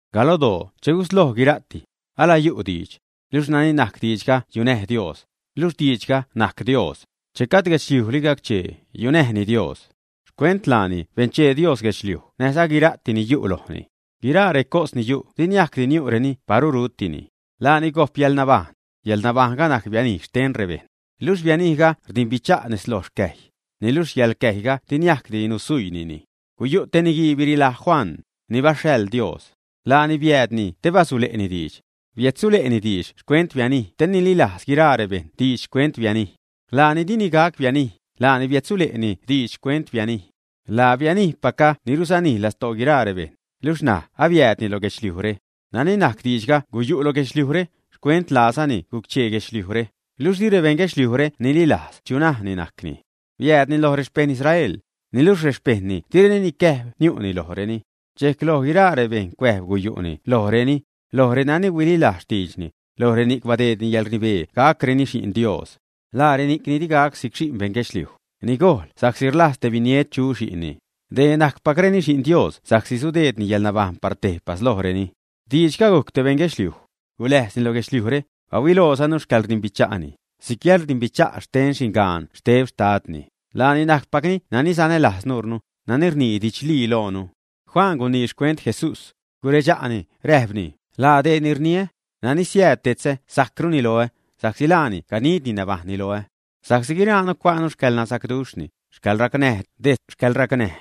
Galodoo che gusloj guira'ti, ala yu' Diidx. Luxh nani najc Diidxga yunäj Dios, luxh Diidxga najc Dios. Che gajd gac-cheeli guedxliuj, yunäjni Dios. Xcuent laani benchee Dios guedxliuj näjza guira'ti ni yu' lojni. Guiraa recos ni yu' di gacdi niu'reni paru rutini. Laani gojp yäḻnabajṉ. Yäḻnabajṉga najc bianij xten rebejṉ. Luxh bianijga rdimbicha' nez lo yäḻcäjy, niluxh yäḻcäjyga di niajcdi nusuiinini. Guyu' te niguii birilaj Juan, ni baxhaḻ Dios. Laani biäädni te basule'ni diidx. Biädsule'ni diidx xcuent bianij te nililajz guiraa rebejṉ diidx xcuent bianij. Laani dini gac bianij, laani biädsule'ni diidx xcuent bianij. Laa bianijpacga ni rusanij lastoo guiraa rebejṉ, luxh ṉaj abiäädni lo guedxliujre. Nani najc Diidxga guyu' lo guedxliujre, xcuent laazani guc-chee guedxliujre, luxh di rebeṉ guedxliujre nililajz chu najni najcni. Biäädni loj rexpeṉ Israel, niluxh rexpejṉni direni nicäjb niu'ni lojreni. Dxejc loj guiraa reni cuäjb guyu'ni lojreni, loj renani huililajz xtiidxni, loj reni'c badeedni yäḻrnibee gacreni xi'n Dios. Laa reni'c ni di gac si'c xi'n beṉ guedxliuj, ni gojl sa'csi rlajz te biniet chu xi'nni, dee najcpacreni Xi'n Dios sa'csi sudeedni yäḻnabajṉ par tejpas lojreni. Diidxga gujc te beṉ guedxliuj. Guläjzni lo guedxliujre, bahuilojzanu xcäḻrdimbicha'ni, si'c yäḻrdimbicha' xten xingan xteb xtadni, laani najcpacni nani sanälajz nuurnu, nani rnii didxlii loonu. Juan gunii xcuent Jesús. Guredxa'ni, räjpni: ―Laa dee ni rniä, nani siääd detzä sajcruni loä, sa'csi laani ganidni nabajṉni loä. Sa'csi guiraanu cua'nu xcäḻnasacduxhni, yäḻracnäj detz yäḻracnäj.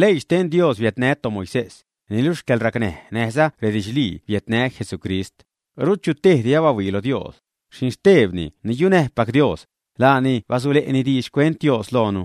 Leii xten Dios biädnä toMoisés, niluxh yäḻracnäj näjza redidxlii biädnä Jesucrist. Rut chu tejdi abahuii lo Dios, xinxtebni ni yunäjpac Dios, laani basule'ni diidx xcuent Dios loonu.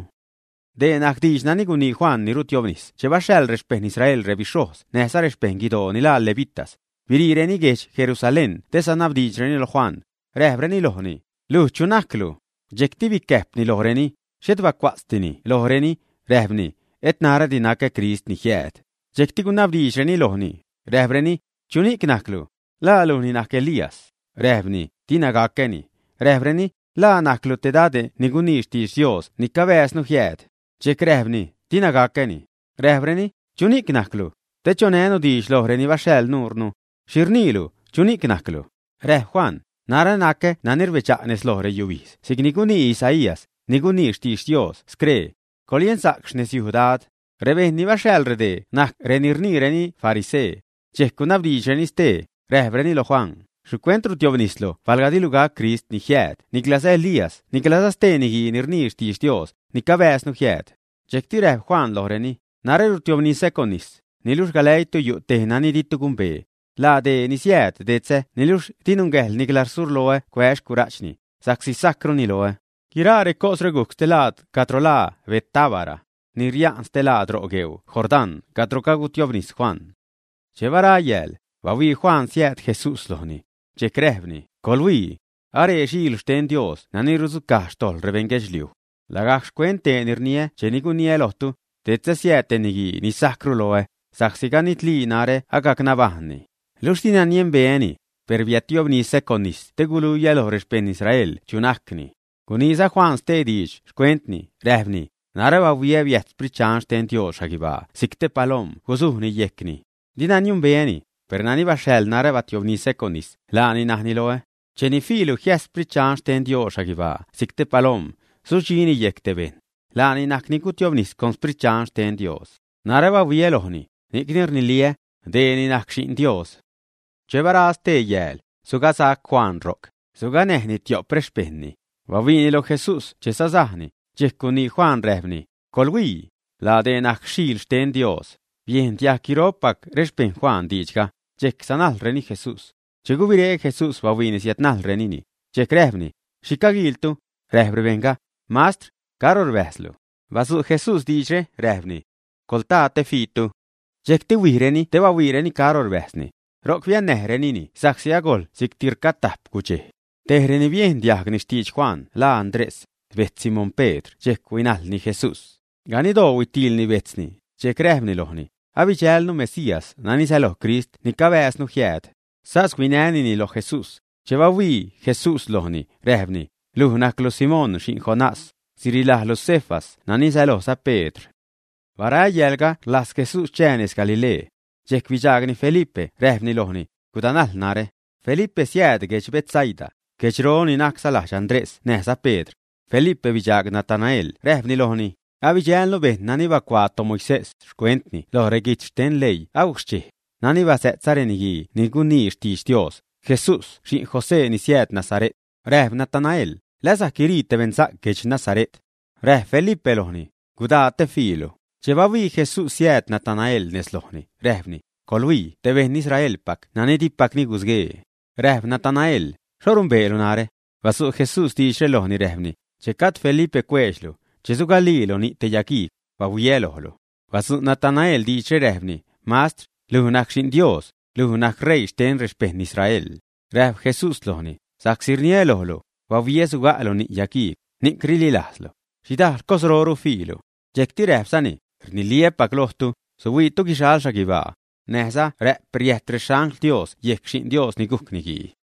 Dee najc diidx nani gunii Juan ni rutiobnis che baxhaḻ rexpejṉ Israel rebixhojz näjza rexpejṉ guidoo ni laa levitas, biriireni guedx Jerusalén te sanabdiidxreni lo Juan, räjpreni lojni: ―¿Luj chu najclu? Dxejcti bicäjpni lojreni, xhet bacua'tzdini lojreni, räjpni: ―Et narädi nacä Crist ni jiääd. Dxejcti gunabdiidxreni lojni, räjpreni: ―¿Chuxhni'c najclu? ¿La lujni najc Elías? Räjpni: ―Dina gacäni. Räjpreni: ―¿La najclu te dade' ni gunii xtidx Dios ni cabääznu jiääd? Dxejc räjpni: ―Dina gacäni. Räjpreni: ―¿Chuxhni'c najclu? Te chonänu diidx loj reni baxhaḻ nuure. ¿Xhi rniilu, chuxhni'c najclu? Räjp Juan: ―Narä nacä nani rbedxa' nez lo reyubijdz si'c ni gunii Isaías, ni gunii xtidx Dios scree: “Coḻyensa'c xnezyuj Dad.” Rebejṉ ni baxhaḻ redee najc reni rniireni “farisee”. Dxejc gunabdiidxreni stee, räjpreni lo Juan: ―¿Xhicuent rutiobnislu palga dilu gac Crist ni jiääd niclaza Elías niclaza stee niguii ni rnii xtidx Dios ni cabääznu jiääd, ä? Dxejcti räjp Juan lojreni: ―Narä rutiobnisä con nis, niluxh galäiitu yu' tej nani ditu gumbee. Laa dee ni siääd detzä niluxh di nungäjḻ nicla surloä cuää́ xcura'chni, sa'csi sajcruni loä. Guiraa recosre gujc stelaad cadro laa Betábara, ni ria'n stelaad ro' gueu Jordán cadro cagutiobnis Juan. Che bara yääl, bahuii Juan siääd Jesús lojni. Dxejc räjpni: ―¡Coḻhuii! Aree Xile' xten Dios nani rudzucaj xtojḻ rebeṉ guedxliuj. Lagajc xcuent dee ni rniä cheni guniä lojtu: “Detzä siääd te niguii ni sajcru loä, sa'csi ganidli narä agac nabajṉni.” Luxh dina niembeäni, per biädtiobnisä con nis te guluiä lo rexpejṉ Israel chu najcni. Guniiza Juan stee diidx xcuentni, räjpni: ―Narä bahuiä biäjt Sprit Dxan xten Dios xhaguibaa si'c te palom guzudxini yejcni. Dina niembeäni, per nani baxhaḻ narä gutiobnisä con nis, laani najni loä: “Cheni fiilu jiäjt Sprit Dxan xten Dios xhaguibaa si'c te palom, sudxini yejc te bejṉ, laanini najc ni gutiobnis con Sprit Dxan xten Dios.” Narä abahuiä lojni, ni'cni rniliä: “Dee ni najc Xi'n Dios.” Che bara stee yääl, sugasac Juan ro'c, suganäjni tio'p rexpejṉni. Bahuiini lo Jesús che sasajni, dxejc gunii Juan, räjpni: ―¡Coḻhuii! ¡Laa dee ni najc Xiil xten Dios! Biejn diajg guiro'p rexpejṉpac Juan diidxga, dxejc sanajlreni Jesús. Che gubiré Jesús bahuiini siädnajlreni, dxejc räjpni: ―¿Xhi caguiiltu? Räjp rebejṉga: ―Mastr, ¿caro rbäjzlu? Badzu' Jesús diidxre, räjpni: ―Coḻtaa, te fiitu. Dxejcti huijreni te bahuiireni caro rbäjzni ro'c. Biannäjrenini ro'c sa'csi agojl si'cti rcatajp gudxej. Tej reni biejn diajgni xtidx Juan laa Andrés, bejtz Simón Pedr dxejc huinäjḻni Jesús. Ganiddoo huitiilni bejtzni, dxejc räjpni lojni: ―Abidxälnu Mesías nani sälojza Crist ni cabääznu jiääd. Sas huinänini loj Jesús. Che bahuii Jesús lojni, räjpni: ―Luj najclu Simón xi'n Jonás; sirilajlu Cefas nani sälojza Pedr. Bara yäälga rlajz Jesús chää nez Galilee. Dxejc bidxaagni Felipe, räjpni lojni: ―Gudanajl narä. Felipe siääd guedx Betsaida, guedxro ni najcza lajdx Andrés näjza Pedr. Felipe bidxaag Natanael räjpni lojni: ―Abidxälnu bejṉ nani bacuaa toMoisés xcuentni lo reguijtz xten leii agujc xchej, nani bazä'tza reniguii ni gunii xtidx Dios, Jesús xi'n José ni siääd Nazare't. Räjp Natanael: ―¿La sajc guirii te beṉsa'c guedx Nazare't, ä? Räjp Felipe lojni: ―Gudaa, te fiilu. Che bahuii Jesús siääd Natanael nez lojni, räjpni: ―Coḻhuii te beṉ Israelpac nani dipacni gusguee. Räjp Natanael: ―¿Xho numbeelu narä? Badzu' Jesús diidxre lojni räjpni: ―Che gajd Felipe cueedx luj, che suga'lilu ni' te yagiigw, bahuiä lojlu. Badzu' Natanael diidxre, räjpni: ―Mastr, luj najc Xi'n Dios, luj najc Reii xten rexpeṉ Israel. Räjp Jesús lojni: ―Sa'csi rniä lojlu, “bahuiä suga'lu ni' yagiigw”, ¿ni'c rililajzlu, ä? Xhidajl cosroru suhuiilu. Dxejcti räjpzani: ―Rniliä́pac lojtu, suhuiitu guixal xhaguibaa, näjza rä'p riäjt rexangl Dios yejc Xi'n Dios ni gujc Niguii.